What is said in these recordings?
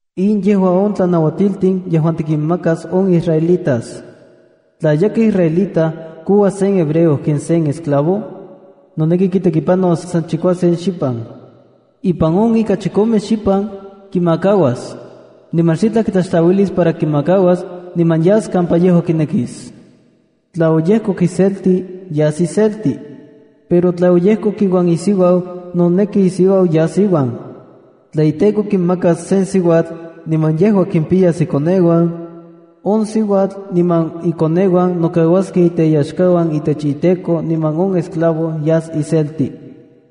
’In yejua on tlanauatiltin yejuan tikinmakas on israelitas: ’Tla yakaj israelita kouas sen hebreo ken se esclavo, noneki kitekipanos san chikuasen xipan. Ipan on ika chikome xipan, kimakauas. Niman xitlaj kitlaxtlauilis para kimakauas niman yas kampa yejua kinekis. Tla oyejkok iselti, yas iselti. Pero tla oyejkok iuan isiuau, noneki isiuau yas iuan. Tla iteko kimakas sen siuatl niman yejua kimpiyas ikoneuan; on siuatl niman ikoneuan nokauaskej teyaxkauan itech iteko niman on esclavo yas iselti.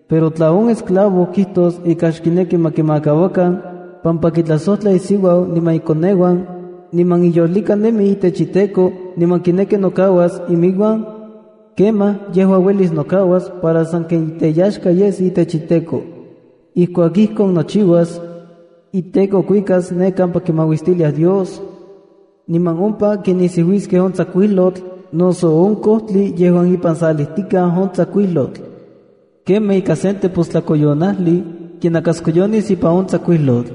Pero tla on esclavo kijtos ika xkineki ma kimakauakan pampa kitlajsojtla isiuau niman ikoneuan niman iyolika nemi itech iteko niman kineki nokauas iminuan, kemaj yejua uelis nokauas para sanken teyaxka yes itech iteko. Ijkuak ijkon nochiuas, iteko kuikas ne kampa kimauistiliaj Dios, niman ompa kinisiuiskej on tsakuijlotl noso on kojtli yejuan ipan salijtikaj on tsakuijlotl. Kemaj ika sen tepostlakoyonajli kinakaskoyonis ipan on tsakuijlotl.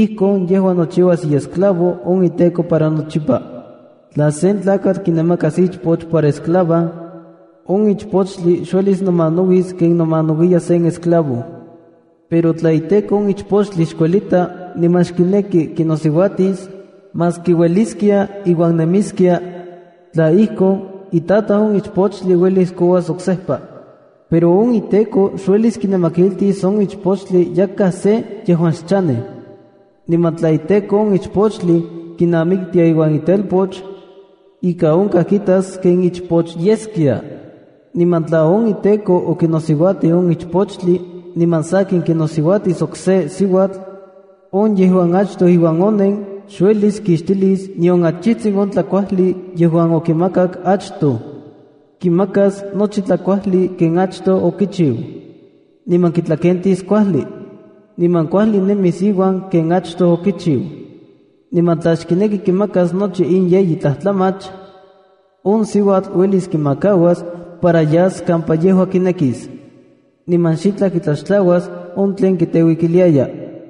Ijkon yejua nochiuas iesclavo on iteko para nochipa. ’Tla sen tlakatl kinamakas ichpoch para esclava, on ichpochtli xuelis nomanauis ken nomanauiya sen esclavo. Pero tla iteko on ichpochtli xkuelita niman xkineki kinosiuatisa, maski ueliskia iuan nemiskia, tla ijkon, itataj on ichpochtli uelis kouas oksejpa. Pero on iteko xuelis kinamakiltis on ichpochtli yakaj se yejuan xchanej. Niman tla iteko on ichpochtli kinamiktia iuan itelpoch, ika onkaj kitas ken ichpoch yeskia. Niman tla on iteko okinosiuatij on ichpochtli niman sakin kinosiuatis okse siuatl, on yejuan achtoj iuan onen, xuelis kixtilis nion achijtsin on tlakuajli yejuan okimakak achtoj. Kimakas nochi tlajkuajli ken achtoj okichiu, niman kitlakentis kuajli, niman kuajli nemis iuan ken achtoj okichiu. Niman tla xkineki kimakas nochi in yeyi tlajtlamach, on siuatl uelis kimakauas para yas kampa yejua kinekis, niman xitlaj kitlaxtlauas on tlen kiteuikiliaya.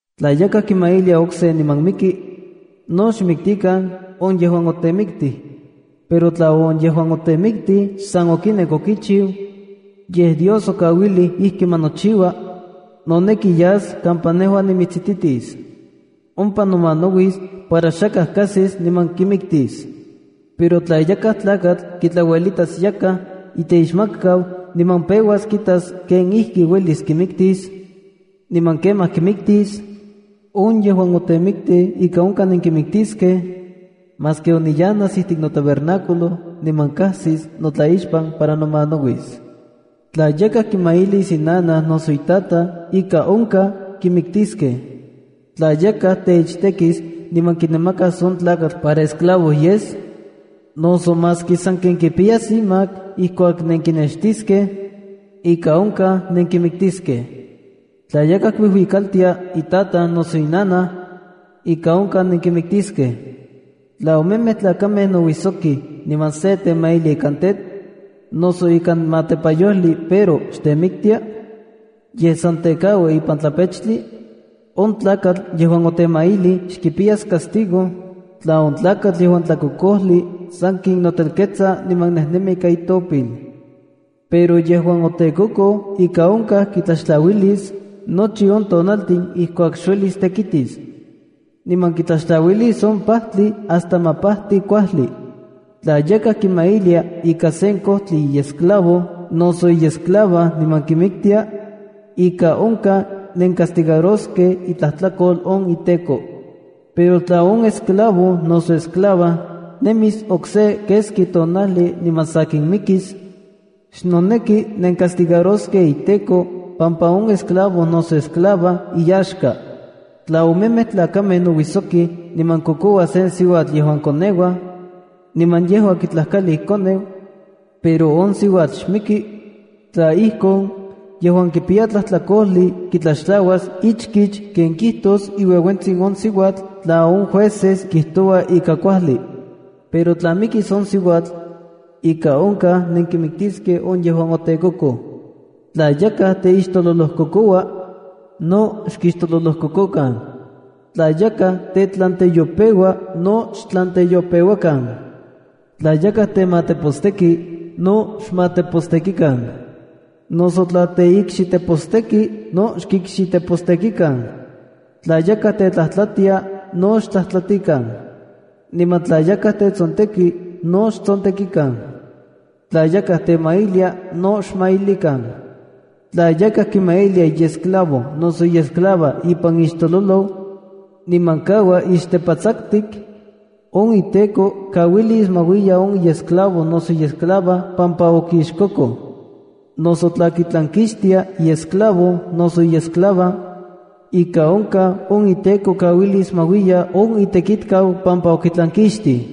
’Tla yakaj kimailia okse niman miki, no xmiktikan on yejuan otemiktij. Pero tla on yejuan otemiktij xsan okinek okichiu, yej Dios okauilij ijki ma nochiua, noneki yas kampa nejua nimitsititis. Ompa nomanauis para xakaj kajsis niman kimiktis. Pero tla yakaj tlakatl kitlauelitas yakaj iteixmatkau niman peuas kitas kenijkiuelis kimiktis, niman kemaj kimiktis, on yejuan otemitij ika onkaj nenkimiktiskej maski oniyanas ijtik notabernáculo niman kajsis notlaixpan para nomanauis. ’Tla yakaj kimailis inanaj noso itataj, ika onkaj kimiktiskej. ’Tla yakaj teichtekis, niman kinamakas on tlakatl para esclavo yes, noso maski sanken kipiyas imak ijkuak nenkinextiskej, ika onkaj nenkimiktiskej. ’Tla yakaj kuijuikaltia itataj noso inanaj, ika onkaj nenkimiktiskej. ’Tla omemej tlakamej nouisokij niman se temailia ikan tetl, noso ikan matepayojli pero xtemiktia, yej san tekaua ipan tlapechtli, on tlakatl yejuan otemailij xkipiyas castigo tla on tlakatl yejuan tlakokojli sakin notelketsa niman nejnemi ika itopil. Pero on yejuan otekokoj ika onkaj kitlaxtlauilis nochi on tonaltin ijkuak xuelis tekitis, niman kitlaxtlauilis on pajtli hasta ma pajti kuajli. ’Tla yakaj kimailia ika sen kojtli iesclavo noso iesclava niman kimiktia, ika onkaj nencastigaroskej itlajtlakol on iteko. Pero tla on esclavo noso esclava nemis okse keski tonajli niman sakin mikis, xnoneki nencastigaroskej iteko pampa on esclavo noso esclava iyaxka. ’Tla omemej tlakamej nouijsokij niman kokouaj sen siuatl yejuan koneuaj, niman yejua kitlajkali ikoneu, pero on siuatl xmiki, tla ijkon, yejuan kipiya tlajtlakojli kitlaxtlauas ichkich ken kijtos iueuentsin on siuatl tla on jueces kijtouaj ika kuajli. Pero tla mikis on siuatl, ika onkaj nenkimiktiskej on yejuan otekokoj. Tla yakaj teixtololojkokoua, no xkixtololojkokokan. Tla yakaj tetlanteyopeua no xtlanteyopeuakan. Tla yakaj temateposteki, no xmatepostekikan, noso tla teikxiteposteki no xkikxitepostekikan. Tla yakaj tetlajtlatia, no xtlajtlatikan. Niman tla yakaj tetsonteki, no xtsontekikan. Tla yakaj temailia, no xmailikan. ’Tla yakaj kimailia iesclavo noso iesclava ipan ixtololoj, niman kaua ixtepatsaktik, on iteko kauilis ma uiya on iesclavo noso iesclava pampa okixkokoj. Noso tla kitlankixtia iesclavo noso iesclava, ika onkaj on iteko kauilis ma uiya on itekitkau pampa okitlankixtij.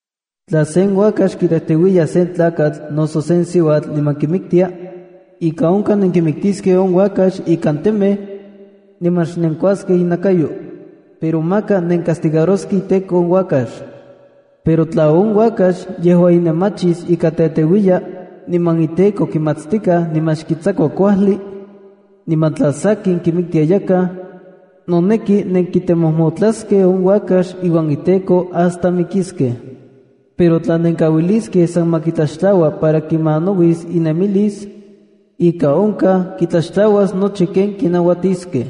’Tla sen uakax kitejteuiya sen tlakatl noso sen siuatl niman kimiktia, ika onkaj nenkimiktiskej on uakax ikan temej, niman xnenkuaskej inakayo. Pero maka nencastigaroskej iteko on uakax. Pero tla on uakax yejua inemachis ika teteuiya, niman iteko kimatstikaj niman xkitsakua kuajli, niman tla sakin kimiktia yakaj, noneki nenkitemojmotlaskej on uakax iuan iteko hasta mikiskej. Pero tla kauiliskej san ma kitlaxtlaua para kimanauis inemilis, ika onkaj kitlaxtlauas nochi ken kinauatiskej.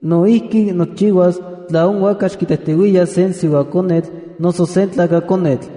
No ijki, nochiuas tla on uakax kitejteuiya sen siuakonetl noso sen tlakakonetl.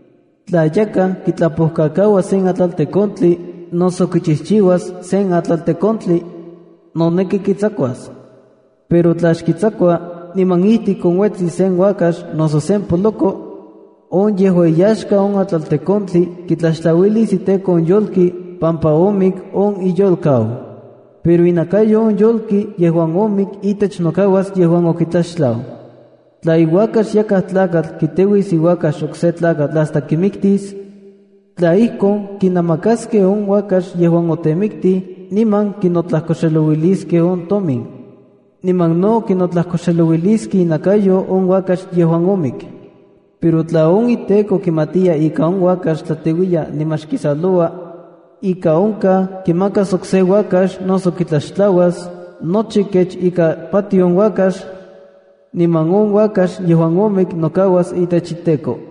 ’Tla yakaj kitlapojkakaua sen atlaltekontli noso kichijchiua sen atlaltekontli, noneki kitsakuas. Pero tla xkitsakua niman ijtik onuetsi sen uakax noso sen poloko, on yejuan iyaxka on atlaltekontli kitlaxtlauilis iteko on yolki pampa omik on iyolkau. Pero inakayo on yolki yejuan omik itech nokauas on yejuan okitlaxtlau. ’Tla iuakax yakaj tlakatl kiteuis iuakax okse tlakatl hasta kimiktis, tla ijkon, kinamakaskej on uakax yejuan otemiktij niman kinotlajkoxelouiliskej on tomin. Niman no kinotlajkoxelouiliskej inakayo on uakax yejuan omik. Pero tla on iteko kimatiya ika on uakax tlateuiya niman xkisaloua, ika onkaj kimakas okse uakax noso kitlaxtlauas nochi kech ika patioj on uakax, niman on uakax yejuan omik nokauas itech iteko.